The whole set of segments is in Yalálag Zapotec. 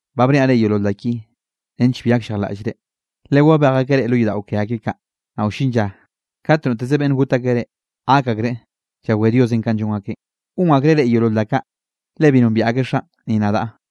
’Ba bniaꞌ reꞌ yeolol da ki nench bi gakllejlaꞌllre. Le wabej akeꞌ reꞌ lo yodaꞌo ke akeꞌ kaꞌ, naꞌ wllin lla kat noteze beꞌnn got akeꞌ reꞌ, gak akreꞌ llawé Dios kanꞌ llon akeꞌn. Gon akreꞌ reꞌ yeolol da kaꞌ, le bi nombiaꞌ akeꞌ Xaꞌn, ni nadaꞌ.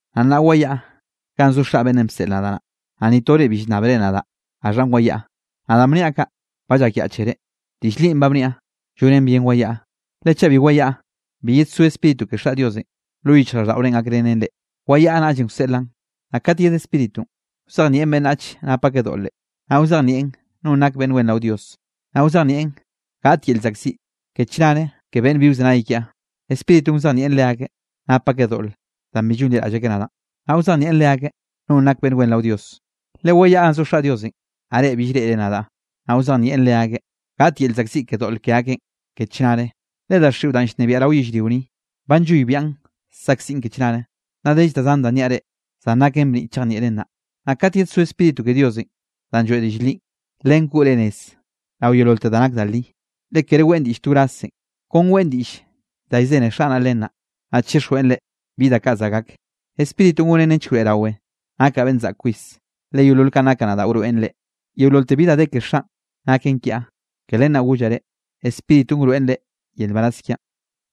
Naꞌ nnaꞌ wayaꞌa ganꞌ zo Xaꞌ beꞌnnenꞌ bseꞌl nadaꞌ naꞌ, ¿naꞌ ni tore bi llnnábere nadaꞌ gaxhanꞌ wayaꞌa? Naꞌ danꞌ bniaꞌ kaꞌ ba llakyaꞌchere. Diꞌll linꞌ ba bniaꞌ, llonen bien wayaꞌa, le chaꞌ bi wayaꞌa, bi yedsó Spíritu ke Xaꞌ Diosenꞌ lo yichjraꞌlldaꞌorenꞌ gakrenen reꞌ. Wayaꞌa naꞌllenꞌ wseꞌlaꞌn. Naꞌ kat yed Spíritunꞌ, wzejnieꞌn beꞌnnach nap akeꞌ doꞌle, naꞌ wzejnieꞌn nonꞌ nak beꞌnn wen rao Dios, naꞌ wzejnieꞌn gaꞌt yel llzaꞌkziꞌ ke chnare ke beꞌnn bi wzenay kiaꞌ. Spíritunꞌ wzejnieꞌn leakeꞌ, nap akeꞌ doꞌl danꞌ bi llonliraꞌll akeꞌ nadaꞌn. Naꞌ wzejnieꞌn leakeꞌ nonꞌ nak beꞌnn wen rao Dios, le wayaꞌa ganꞌ zo Xaꞌ Diosenꞌ, naꞌ reꞌ bill reꞌre nadaꞌ. Naꞌ wzejnieꞌn leakeꞌ, gaꞌt yel llzaꞌkziꞌ ke doꞌl ke akeꞌn ke chnare, le daxiꞌon danꞌ llnebiaꞌ rao yellrio ni, ba nlloybiaꞌn saꞌkziꞌn ke chnare. ’Nnaꞌ dell da zan da nniaꞌ reꞌ, zan naken bniꞌ chejnieꞌren nnaꞌ. Naꞌ kat yedsó Spíritu ke Diosenꞌ danꞌ lloeꞌ diꞌll linꞌ, len koꞌ reꞌ nez rao yeololte da nak da li, le kere weꞌn diꞌll to wrazzen, kon weꞌn diꞌll da llzene Xaꞌ naꞌ len naꞌ, naꞌ chixjweꞌn reꞌ bi da kaꞌ za gak. Spíritunꞌ gonen nench wroeꞌrawe, nakaꞌ beꞌnn zaꞌke kwis, le yeolol kanꞌ nakaꞌ nadaꞌ wroeꞌn reꞌ. Yeololte bi da de ke Xaꞌn naken kiaꞌ, ke len naꞌ gollaꞌ reꞌ, Spíritunꞌ wroeꞌn reꞌ yel nbaraz kiaꞌn.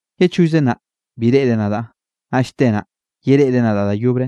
’Ye chollze naꞌ, bi reꞌre nadaꞌ, naꞌll te naꞌ, yereꞌre nadaꞌ da yobre,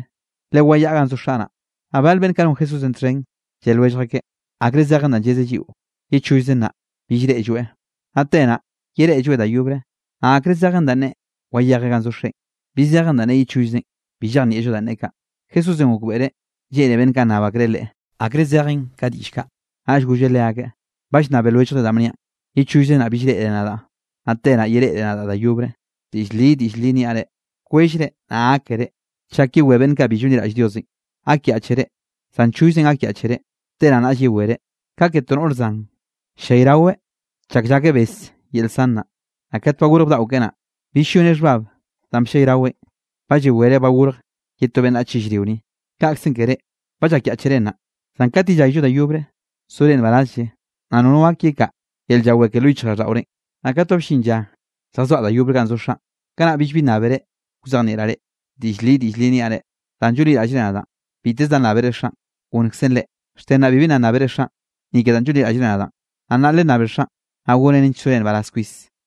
le wayaꞌa ganꞌ zo Xaꞌ naꞌ. Naꞌ bal beꞌnn kaꞌ non Jesúsenꞌ txhen, lle lwellj akeꞌ: —¿Akre zejen danꞌ llezeꞌ lliꞌo, ye chollze naꞌ, bill reꞌlloeꞌ, naꞌ te naꞌ, yereꞌlloeꞌ da yobre? Naꞌ ¿akre zejen danꞌ neꞌe, wayejeꞌ ganꞌ zo Xeꞌen? ¿Bi zejen danꞌ neꞌe ye chollzenꞌ? Bi llejnieꞌllo danꞌ neꞌe kaꞌ. Jesúsenꞌ gokbeꞌreꞌ lleꞌne beꞌnn kaꞌ nnab akreꞌ Leꞌe, akre zejen ka diꞌll kaꞌ, naꞌll golleꞌ leakeꞌn: —¿Ba llnnabe lwelljre danꞌ bniaꞌn: “Ye chollze naꞌ bill reꞌre nadaꞌ, naꞌ te naꞌ, yereꞌre nadaꞌ da yobre”? Diꞌll li, diꞌll li niaꞌ reꞌ: Kwellre naꞌ gákere, chak yewé beꞌnn kaꞌ bi llonliraꞌll Diosenꞌ. Gakyaꞌchere, zan chollze gakyaꞌchere, te naꞌ naꞌll yewere. Ka ke to noꞌre zan, ll-llayraweꞌ chak llake bes yel zan naꞌ. Naꞌ kat ba gorj bdaꞌo keꞌe naꞌ, bill lloneꞌ xhbab danꞌ bllayraweꞌn, ba llawereꞌ ba gorj ye to beꞌnnach yellrio ni. Kaꞌkzenꞌ ke reꞌ, ba llakyaꞌchere nnaꞌ, zan kat yellayllo da yobre sore nbarazlle, naꞌ nono gak yekaꞌa yel llawé ke lo yichjraꞌlldaꞌorenꞌ. ’Naꞌ kate ba bllin lla lljazoaꞌ da yobre ganꞌ zo Xaꞌn, kanaꞌ billbi nnábere wzejnieꞌraꞌ reꞌ. Diꞌll li, diꞌll li niaꞌ reꞌ: Danꞌ llonliraꞌllre nadaꞌn, biteze da nnábere Xaꞌn, gonnkzeꞌn reꞌ. Xte nnaꞌ bibi nna nnábere Xaꞌn, ni ke danꞌ llonliraꞌllre nadaꞌn. Naꞌ nnaꞌ lennabe Xaꞌn, naꞌ gonneꞌn nench sore nbaraz kwis.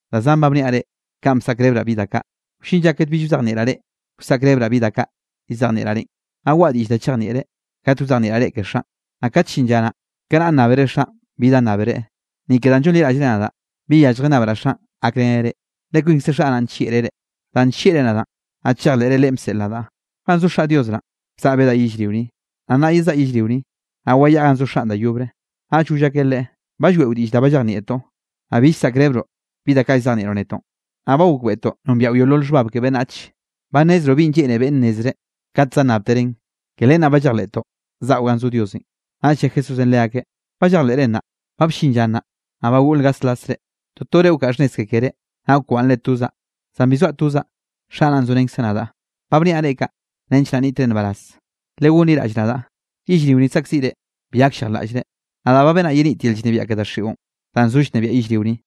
’Da zan ba bniaꞌ reꞌ kanꞌ bsaꞌkrebraꞌ bi da kaꞌ. Wllin lla kate bill wzejnieꞌraꞌ reꞌ, wsaꞌkrebraꞌ bi da kaꞌ llzejnieꞌraꞌ reꞌn. Naꞌ waꞌa diꞌll da chejnieꞌre kat wzejnieꞌraꞌ reꞌ ke Xaꞌn. Naꞌ kat llin lla naꞌ, kanaꞌ nnábere Xaꞌn bi da nnábere, ni ke danꞌ llonliraꞌllre nadaꞌ. Bi yalljen nnabraꞌ Xaꞌn gakreneꞌ reꞌ. Le kwinkze Xaꞌ naꞌn nllieꞌreꞌ reꞌ, danꞌ nllieꞌre nadaꞌn, naꞌ chejleꞌre Leꞌen bseꞌl nadaꞌ. Ganꞌ zo Xaꞌ Dios naꞌn, bzaꞌa bedaꞌ yellrio ni, naꞌ nnaꞌ yezaꞌa yellrio ni. Naꞌ wayaꞌa ganꞌ zo Xaꞌn da yobre. Naꞌll goll akeꞌ Leꞌe: —Ba lloeꞌo diꞌll da ba llejnieꞌtoꞌ, naꞌ bill llsaꞌkrebroꞌ bi da kaꞌ llzejnieꞌroꞌ netoꞌn. Naꞌ ba gokbeꞌtoꞌ nombiaꞌo yeolol xhbab ke beꞌnnach. Ba nnezroꞌ binꞌ lleꞌne beꞌnne nnezreꞌ kat za nnabtereꞌn. Ke len naꞌ ba llejleꞌtoꞌ zaꞌo ganꞌ zo Diosenꞌ. Naꞌll lle Jesúsenꞌ leakeꞌ: —¿Ba llejleꞌre nnaꞌ? Ba bllin lla nnaꞌ, naꞌ ba goꞌl gaslasre. Totore wkaꞌa xhnnez ke keré, naꞌ wkwaꞌnnre tozaꞌ. Zan bi zoaꞌ tozaꞌ, Xaꞌ naꞌn zorenkzeꞌ nadaꞌ. Ba bniaꞌ reꞌ kaꞌ, nench naꞌ nniꞌtre nbaraz, legonliraꞌll nadaꞌ. Yellrio ni saꞌkziꞌre, bi gakllejlaꞌllre, nadaꞌ ba benaꞌ yenit yel llnebiaꞌ ke daxiꞌon, danꞌ zo llnebiaꞌn yellrio ni.